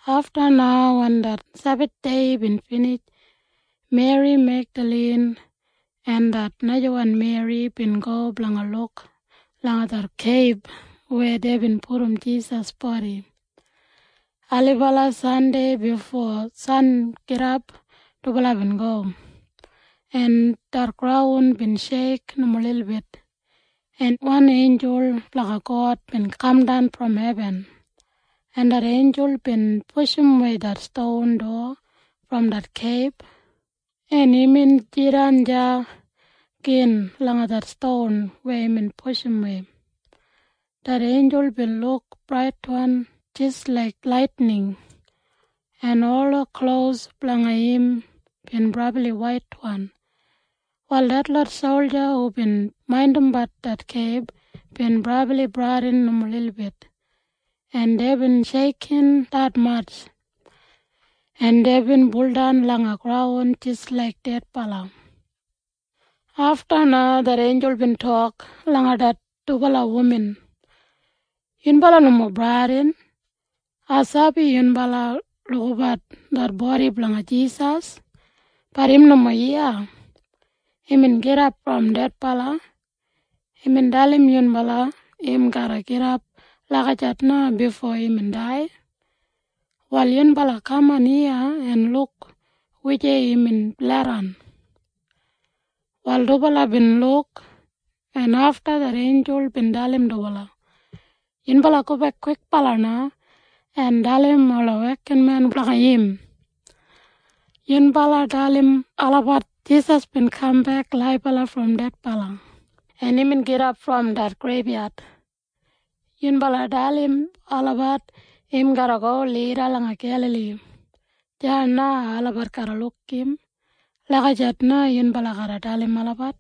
Afta na wen det Sebathdei bin binij, Meri Megdalin en det najawan Meri bin go blanga luk langa det keib weya deibin pudum Jisas bodi. Ailibala Sandei bifo sangidap dubala bin go, en det graun bin sheik nomo lilbit, en wan einjul blanga God bin kamdan brom hebin, en det einjul bin pushumwei det ston dowa brom det keib, en imbin jidan deya gin langa det ston weya imbin pushumwei. Det einjul bin luk braitwan jis laik laitining, en ola klos blanga im bin brabli waitwan. Wal detlot solja hubin maindimbat det keib bin brabli bradin nomo lilbit, en deibin sheikin detmatj, en deibin buldan langa graun jis laik dedbala. Afta na det einjul bin tok langa det dubala wuman, “Yunbala nomo bradin. Ai sabi yunbala lukabat det bodi blanga Jisas. Bat im nomo iya. Imbin gidap brom dedbala. Imbin dalim yunbala im garra gidap lagijat na bifo imbin dai. Wal yunbala kaman iya en luk wujei imbin leidan.” Wal dubala bin luk, en afta det einjul bin dalim dubala, “Yunbala gobek kwikbala na en dalim ola wekinmen blanga im. Yunbala dalim olabat Jisas bin kambek laibala brom dedbala, en imbin gidap brom det greibyad. Yunbala dalim olabat im garra go lida langa Gelali. Deya na olabat garra luk im. Lagijat na yunbala garra dalim olabat.”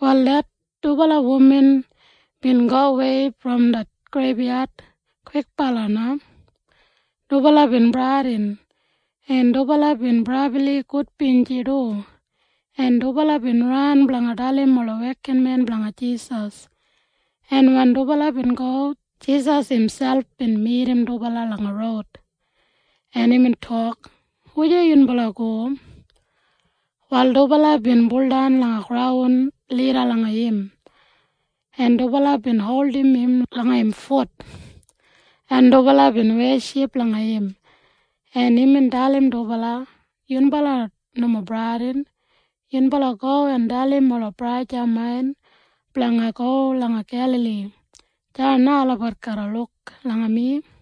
Wal det dubala wuman bin gowei brom det greibyad kwikbala na. Dubala bin bradin, en dubala bin brabli gudbinji du, en dubala bin ran blanga dalim ola wekinmen blanga Jisas. En wen dubala bin go, Jisas imselp bin midim dubala langa roud, en imbin tok, “Wujei yunbala go?” Wal dubala bin baudan langa graun lida langa im, en dubala bin holdim im langa im fut, en dubala bin weship langa im, en imbin dalim dubala, “Yunbala nomo bradin. Yunbala go en dalim ola braja main blanga go langa Gelali. Deya na olabat garra luk langa mi.”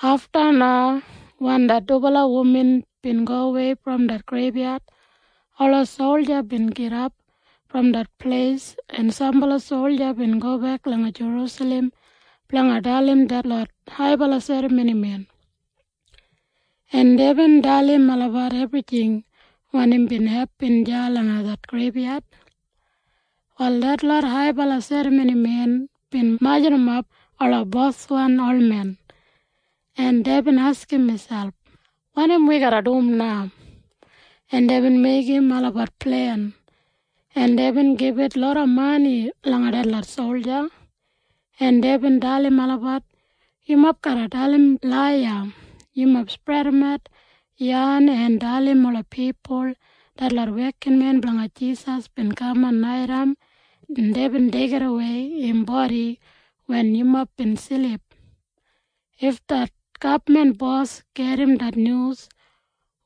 Afta na wen det dubala wuman bin gowei brom det greibyad, ola solja bin gidap brom det pleis, en sambala solja bin gobek langa Jerusalem blanga dalim detlot haibala serramonimen, en deibin dalim olabat ebrijing wanim bin hepin deya langa det greibyad. Wal detlot haibala serramonimen bin majurrumap ola boswan olmen, en deibin askim miselp, “Wanim wi garra dum na?” En deibin meigim olabat plen, en deibin gibit loda mani langa detlot solja, en deibin dalim olabat, “Yumob garra dalim laiya. Yumob spredimat yan en dalim ola pipul detlot wekinmen blanga Jisas bin kaman naitaim en deibin deigidawei im bodi wen yumob bin silip. If det gabman bos gedim det nyus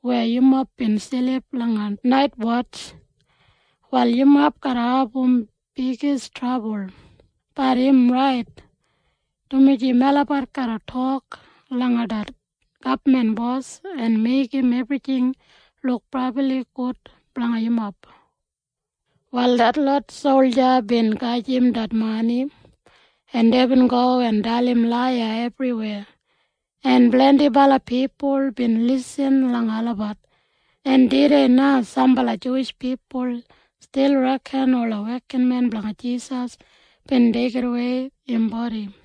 weya yumob bin silip langa naitwotj, wal yumob garra abum bigis trabul. Bat im rait, dumaji melabat garra tok langa det gabman bos en meigim ebrijing luk brabli gud blanga yumob.” Wal detlot solja bin gajim det mani, en deibin go en dalim laiya ebriweya, en blendibala pipul bin lisin langa olabat, en tudei na sambala Juwish pipul stil reken ola wekinmen blanga Jisas bin deigidawei im bodi.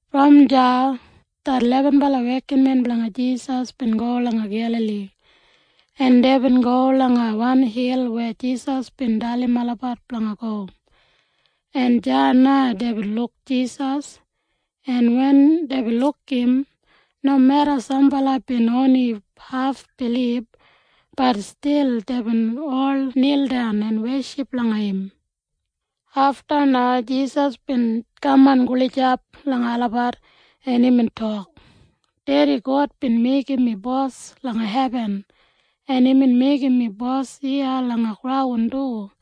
Brom deya det lebenbala wekinmen blanga Jisas bin go langa Gelali, en deibin go langa wan hil weya Jisas bin dalim olabat blanga go, en deya na deibin luk Jisas, en wen deibin luk im, nomeda sambala bin oni hafbilib, bat stil deibin ol nildan en weship langa im. Afta na Jisas bin kaman gulijap langa olabat, en imbin tok, “Dedi God bin meigim mi Bos langa hebin, en imbin meigim mi Bos iya langa graun du,